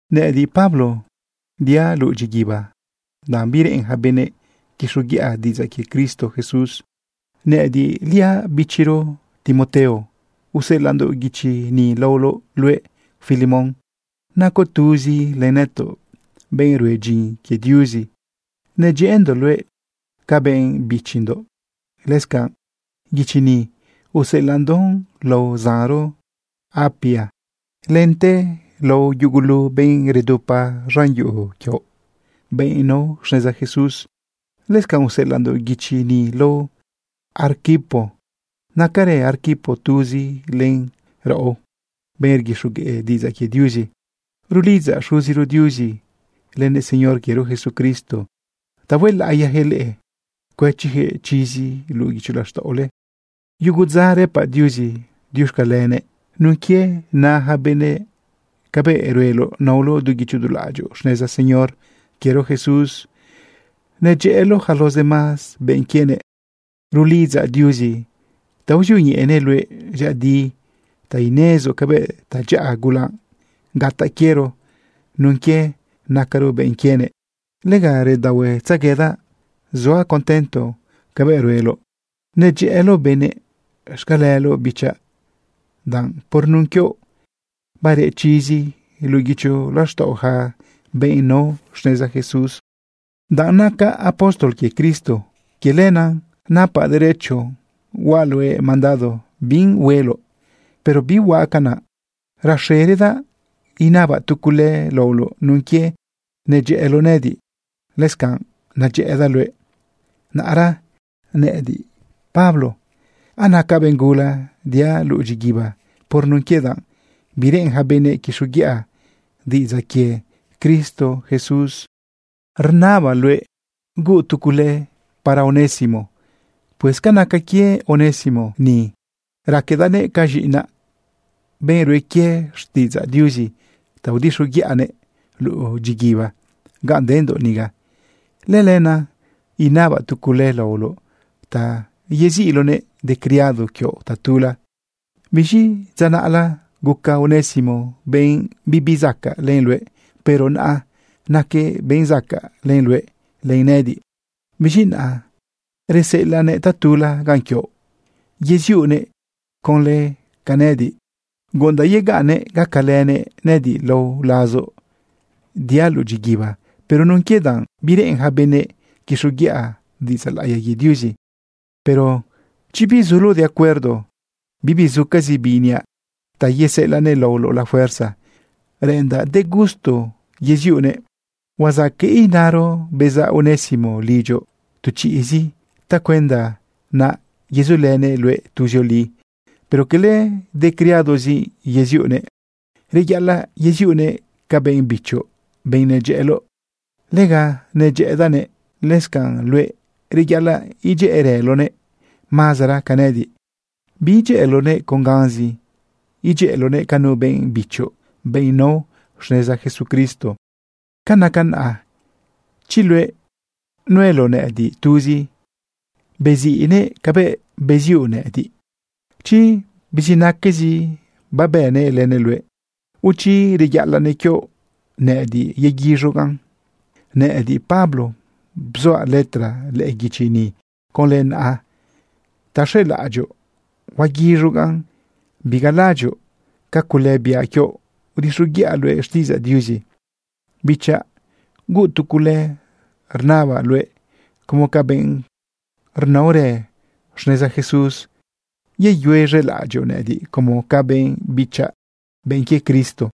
Nëꞌëdiꞌ, Pablo, diaꞌ luꞌu dyiguiba danꞌ bireꞌen yaca benëꞌ quixoguiꞌa diꞌidzaꞌ quie Cristo Jesús. Nëꞌëdiꞌliaꞌ bichiro Timoteo useꞌelaꞌndoꞌ guichi ni laoloꞌ luëꞌ, Filemón. Nacoꞌ tuzi len nëtoꞌ, benꞌ rue dyin quie Diuzi. Nedyëꞌëndoꞌ luëꞌ ca benꞌ bichindoꞌ. Lëscanꞌ guichi ni useꞌelaꞌndoꞌ lao zanro Apia lente lao yugulu benꞌ redupa z̃an yuꞌu quioꞌ, benꞌ nao xneza Jesús. Lëscanꞌ useꞌelaꞌndoꞌ guichi ni lao Arquipo. Nacarë Arquipo tuzi len raꞌo, benꞌ rguixogueꞌ diꞌidzaꞌ quie Diuzi. Rulidzaꞌ Xuziro Diuzi lënëꞌ Señor quiero Jesucristo ta huelaꞌiyaquëꞌ leꞌe, cuëchiyaquëꞌ chizi luꞌu guicho laxtaꞌole. Yugo dza rëpaꞌ Diuzi diuxcalenëꞌ nun quie na yaca benëꞌ cabëꞌ rueloꞌ naoloꞌ du guicho du laꞌadyoꞌ xneza Señor quiero Jesús nedyëꞌëloꞌ yaca los demás benꞌ quienëꞌ. Rulidzaꞌ Diuzi ta uzioñeꞌenëꞌ luëꞌ dyëꞌëdi ta inezoꞌ cabëꞌ tadyaꞌa gula gataꞌ quiero nun quie nacaro benꞌ quienëꞌ. Lega redaohuetzeguedaꞌ zuaꞌ contento cabëꞌ rueloꞌ nedyëꞌëloꞌ benëꞌ. Xcaleloꞌ, bichaꞌ, danꞌ por nun quioꞌ bareꞌ chizi luꞌu guicho laxtaꞌo yaca benꞌ nao xneza Jesús. Danꞌ nacaꞌ apóstol quie Cristo, quie lenaꞌ napaꞌ derecho huaꞌ luëꞌ mandado bi hueloꞌ, pero bihuaꞌ canaꞌ. Raxeradaꞌ inabaꞌ tu cule laoloꞌ nun quie nedyëꞌëloꞌ nëꞌëdiꞌ, lëscanꞌ nedyëꞌëdaꞌ luëꞌ. Naꞌra nëꞌëdiꞌ, Pablo, anacaꞌ benꞌ gula diaꞌ luꞌu dyiguiba por nun quie danꞌ bireꞌen yaca benëꞌ quixoguiꞌa diꞌidzaꞌ quie Cristo Jesús, rnabaꞌ luëꞌ huuꞌ tu cule para Onésimo. Pues ca naca quie Onésimo ni, raquedaꞌnëꞌ ca z̃iꞌinaꞌ, benꞌ rue quie xtiꞌidzaꞌ Diuzi ta udixoguiꞌanëꞌ luꞌu dyiguiba ganꞌ dendoꞌ niga. Lëlenaꞌ inabaꞌ tu cule laoloꞌ ta yeziꞌloꞌnëꞌ de criado quioꞌ tatula. Biz̃i dza naꞌla guca Onésimo benꞌ bibi zacaꞌ len luëꞌ, pero naꞌa naquëꞌ benꞌ zacaꞌ len luëꞌ len nëꞌëdiꞌ. Biz̃i naꞌa reseꞌelaꞌnëꞌ tatula ganꞌ quioꞌ yeziuꞌnëꞌ conlë ca nëꞌëdiꞌ. Guꞌundaꞌ yegaꞌnnëꞌ gacalënëꞌ nëꞌëdiꞌ lao lazoꞌ diaꞌ luꞌu dyiguiba por nun quie danꞌ bireꞌen yaca benëꞌ quixoguiꞌa diꞌidzaꞌ laꞌiya quie Diuzi. Pero chi bizuloꞌ de acuerdo, bibi zucazi bi iniaꞌ ta yeseꞌelaꞌnëꞌ laoloꞌ la fuerza. Reꞌendaꞌ de gusto yeziuꞌnëꞌ. Huazaqueꞌ inaro bezaꞌ Onésimo lidyoꞌ tu chiꞌzi tacuenda naꞌa yezulënëꞌ luëꞌ tuzioli. Pero cala de criadozi yeziuꞌnëꞌ. Reyaꞌalaꞌ yeziuꞌnëꞌ ca benꞌ bichoꞌ, benꞌ nedyëꞌëloꞌ. Lega nedyëꞌëdaꞌnëꞌ. Lëscanꞌ luëꞌ, reyaꞌalaꞌ idyëꞌërëloꞌnëꞌ mazara ca nëꞌëdiꞌ. Biidyëꞌëloꞌnëꞌ con ganzi, idyëꞌëloꞌnëꞌ ca nu benꞌ bichoꞌ, benꞌ nao xneza Jesucristo. Ca naca naꞌa, chi luëꞌ nueloꞌ nëꞌëdiꞌ tuzi, beziꞌnëꞌ cabëꞌ beziuꞌ nëꞌëdiꞌ. Chi bizinaquezi babënëꞌ lënëꞌ luëꞌ, o chi reyaꞌalaꞌnëꞌ quioꞌ, nëꞌëdiꞌ yeguiz̃ugaꞌn. Nëꞌëdiꞌ, Pablo, bzuaꞌ letra lëꞌë guichi ni conlë naꞌa ta xelaꞌadyoꞌ huaguiz̃ugaꞌn. Bigalaꞌadyoꞌ ca cule biaꞌ quioꞌ udixoguiꞌa luëꞌ xtiꞌidzaꞌ Diuzi. Bichaꞌ huuꞌ tu cule, rnabaꞌ luëꞌ como ca benꞌ rnaorë xneza Jesús, yeyuez̃elaꞌadyoꞌ nëꞌëdiꞌ como ca benꞌ bichaꞌ, benꞌ quie Cristo.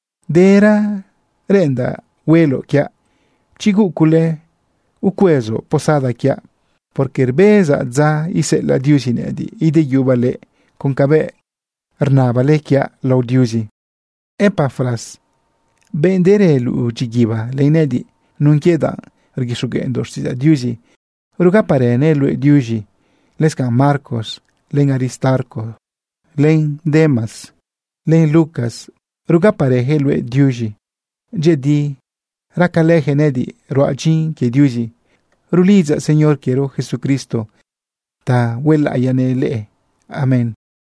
Dera reꞌendaꞌ hueloꞌ quiaꞌ, chi huuꞌ cule, ucuezoꞌ posada quiaꞌ, porque rbezaꞌ dza iseꞌelaꞌ Diuzi nëꞌëdiꞌ ideyubaꞌ leꞌe con cabëꞌ rnabale quiaꞌ lao Diuzi. Epafras, benꞌ derë luꞌu dyiguiba len nëꞌëdiꞌ nun quie danꞌ rguixogueꞌndoꞌ xtiꞌidzaꞌ Diuzi, rugaparënëꞌ luëꞌ diuz̃i. Lëscanꞌ Marcos, len Aristarco, len Demas, len Lucas, rugaparëyaquëꞌ luëꞌ diuz̃i. Dyëꞌëdi racalëyaquëꞌ nëꞌëdiꞌ ruaꞌ dyin quie Diuzi. Rulidzaꞌ Señor quiero Jesucristo ta huelaꞌiyanëꞌ leꞌe. Amén.